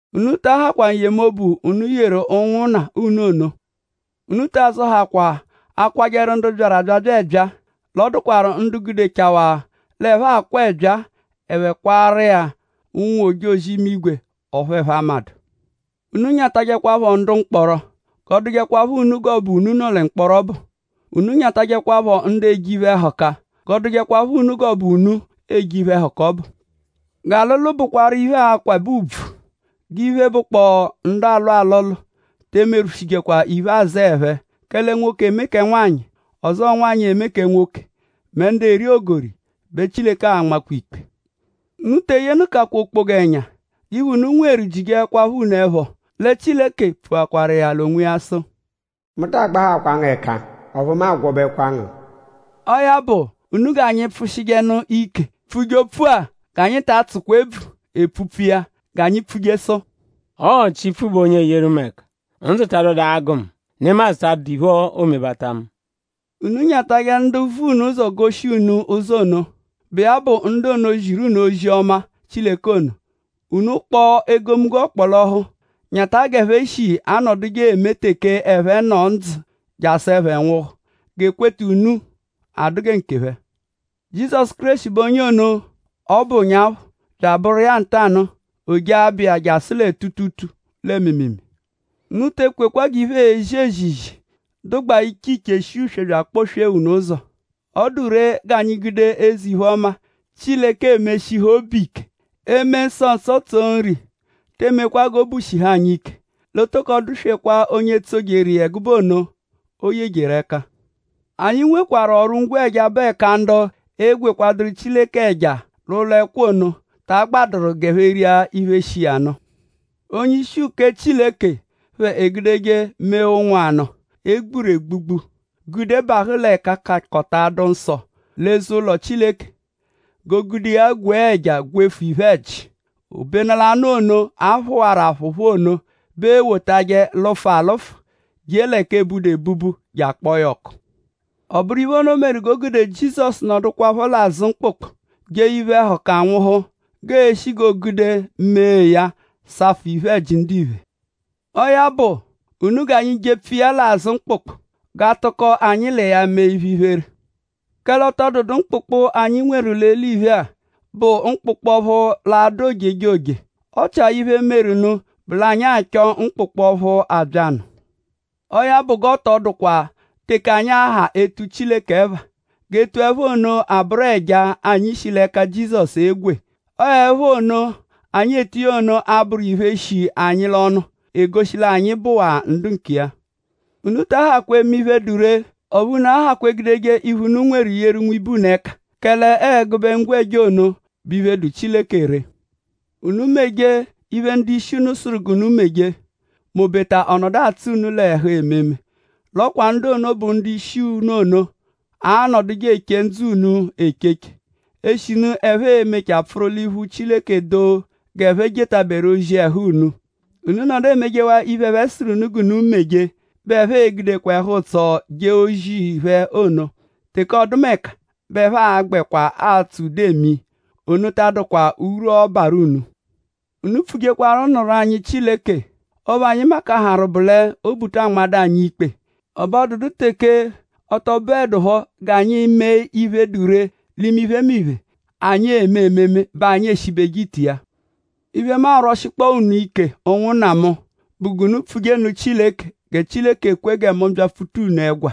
Unu ta ahakwa n-yemobu unu yeru ụnwunna unu ono. Unu ta azọhakwa akwajẹru ndu byaru abyabya ẹbyaa; l'ọ dụkwaru ndu gudechawaa l'ẹphe akwaa ẹbyaa; ẹphe kwaaru iya ụnwu-ojozi-imigwe; ọphu ẹphe amadụ. Unu nyatajẹkwapho ndu mkpọro; g'ọ dụjekwapho unu g'ọ bụ unu nọ mkpọro ọbu. Unu nyatajẹkwapho ndu eje iphe-ẹhuka; g'ọ dụjekwapho unu g'ọ bụ unu eje iphe-ẹhuka ọbu. G'alụlu bụkwaru iphe, akwabẹ ùbvù; g'iphe, bụ ndu alụ alụlu te emerwụshijekwa iphe-azẹe phẹ; kẹle nwoke eme kẹ nwanyị; ọzo nwanyị, eme kẹ nwoke; mẹ ndu eri ogori bẹ Chileke a-nmakwa ikpe. Unu te eyenụkakwa okpoga ẹnya. G'iphe, unu nweru jijeẹkwapho unu ẹpho. Lẹ Chileke pfuakwaru iya l'onwiya sụ: “Mu ta agbahakwa ngu ẹka; ọphu mu a-gwọbekwa ngu.” Ọo ya bụ; unu g'anyi pfụshijenu ike pfuje opfu-a; g'anyi ta atsụjekwa ebvu epfupfu iya. G'anyi pfuje sụ: “Ọo Chipfu bụ onye eyeru mu ẹka; ndzụ ta abyadụ agụ mu; nemadzụ ta adụdu iphe, oomebata mu.” Unu nyatajẹ ndu ono, vu ụzo goshi unu ụzo ono, bụ iya bụ ndu ono, ziru unu ozi-ọma Chileke ono. Unu kpọo egomunggo ọkpolohu; nyata g'ẹphe shi anọduje eme teke ẹphe nọ ndzụ jasụ ẹphe nwụhu; g'ekweta unu dụkwa gẹ nkephẹ. Jizọsu Kéreshi bẹ bụ onye ono, ọ bụ ụnyaphu; bya abụru iya ntanụ-a; o jee l'abụ iya jasụ lẹ tuutuutuu lẹ mịimiimii. Unu te ekwekwa g'iphe eezi ezizi, dụgbaa iche iche shi uswe bya akpọ-swee unu ụzo. Ọ dụ ree g'anyi gude eze-iphe-ọma, Chileke eme shihu obu ike. Eme nsọ nsọ, tso nri tee mekwa g'obu shihu anyi ike; l'o tokọ dụ-swekwaa onye tsojeru iya ẹgube ono, o yejeru ẹka. Anyi nwekwarụ ọru-ngwẹja bụ ẹka ndu egwekwadụru Chileke ẹja l'ụlo-ẹkwa ono ta agbadụru g'ẹphe ria iphe, shi iya nụ. Onye-ishi uke Chileke phẹ egudeje mee ụnwu anụ, e gburu egbugbu gude abahụ lẹ Ẹka-kakọta-adụ-nsọ l'eze-ụlo Chileke; g'o gude iya gwee ẹja gwefu iphe-ẹji; obenu l'anụ ono, a phụwaru aphụphu ono bẹ eewotajẹ lụfu alụfu je l'ẹka eebudu ebubu je akpọo ya ọku. Ọ bụru iphe ono meru g'o gude Jizọsu nọdukwapho l'azụ mkpụkpu jee iphe-ẹhuka nwụhu; g'eeshi g'oogude mee ya safụ iphe-ẹji ndiphe. Ọo ya bụ; unu g'anyi jepfu iya l'azụ mkpụkpu g'a tụko anyi l'iya mee iphe-iphere. Kẹle ọ tọ dụdu mkpụkpu, anyi nweru l'eliphe-a, bụ mkpụkpu ọphu l'a-dụ ojejoje; ọ chia iphe, meru nụ bụ l'anyi achọ mkpụkpu ọphu abya nụ. Ọo ya bụ; g'ọ tọ dụkwa teke anyi a-ha etuje Chileke ẹpha; g'etu ẹpha ono abụru ẹja, anyi shi l'ẹka Jizọsu egwe. Ọo ẹpha ono, anyi etu iya ono a-bụru iphe, shi anyi l'ọnu, egoshi l'anyi bụwaa ndu nkiya. Unu ta ahakwa eme iphe, dụ ree; ọphu unu ahakwa egudeje iphe, unu nweru yeru nwibe unu ẹka; kẹle ọo ẹgube ngwẹja ono bụ ọphu dụ Chileke ree. Unu meje iphe, ndu-ishi unu sụru g'unu meje; m'obeta ọ nọdu atsụ unu l'ẹhu ememe. L'ọ kwa ndu ono, bụ ndu-ishi ono anọduje eche ndzụ unu echeche; eshinu ẹphe e-mechaa pfụru l'iphu Chileke doo g'ẹphe jetaberu ozi ẹhu unu. Unu -nọdu emejewaa iphe, ẹphe sụru g'unu meje bẹ ẹphe e-gude ẹhu-ụtso jee ozi phẹ ono. Teke ọdumeka bẹ ẹphe a-gbẹkwa atsụ ude eme iya; ono ta adụdu urwu, ọo-barụ unu. Unu pfujekwaru nụru anyi Chileke. Ọphu anyi makaharụ bụ l'obu ta anmadụ anyi ikpe; ẹbe ọ dụdu teke ọ tọ bụedupho g'anyi mee iphe, dụ ree l'iphemiphe, anyi eme ememe bẹ anyi eshibeje ite iya. Iphe, mu arwọshikpoo unu ike; ụnwunna mu; bụ g'unu pfuje nụ Chileke; gẹ Chileke kwe gẹ mu byapfuta unu ẹgwa.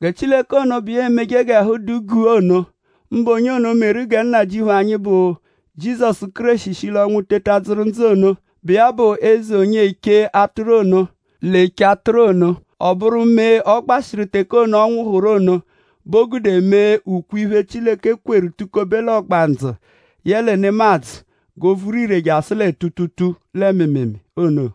Gẹ Chileke ono, bụ iya emeje g'ẹhu dụ guu ono; mbụ onye ono meru gẹ Nnajịuphu anyi, bụ Jizọsu Kéreshi shi l'ọnwu teta dzụru ndzụ ono; bụ iya bụ Eze onye eche atụru ono, l'eche atụru ono; ọ bụru mee, ọ gbashịru teke ono, ọ nwụhuru ono bẹ o gude mee ukwe-iphe, Chileke kweru tukobe l'ọgbandzu yẹle nemadzụ g'o vuru ire jasụ lẹ tuutuutuu lẹ mịimiimii ono;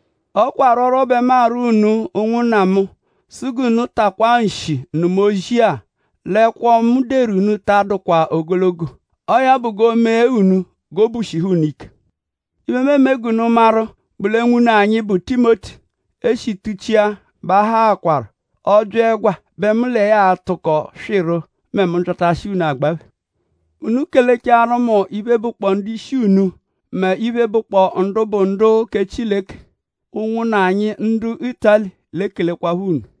Ọ kwa arwọrwo bẹ mu arwọ unu; ụnwunna mu; sụ g'unu takwaa nshi nụma ozi-a; l'ẹkwo-a, mu deru unu-a ta adụkwa ogologo. Ọo ya bụ g'oomee unu g'obu shihu unu ike. Iphe, mu eme g'unu maru bụ lẹ nwune anyi, bụ Timoti, e shi tuchia bẹ a haakwaru. Ọ -bya ẹgwa bẹ mu l'iya a-tụko swịru mẹ mu -byatashia unu agbaphe. Unu kelechaaru mu iphe, bụkpoo ndu-ishi unu mẹ iphe, bụkpoo ndu bụ ndu kẹ Chileke. Ụnwunna anyi ndu Ịtali l'ekelekwaphọ unu.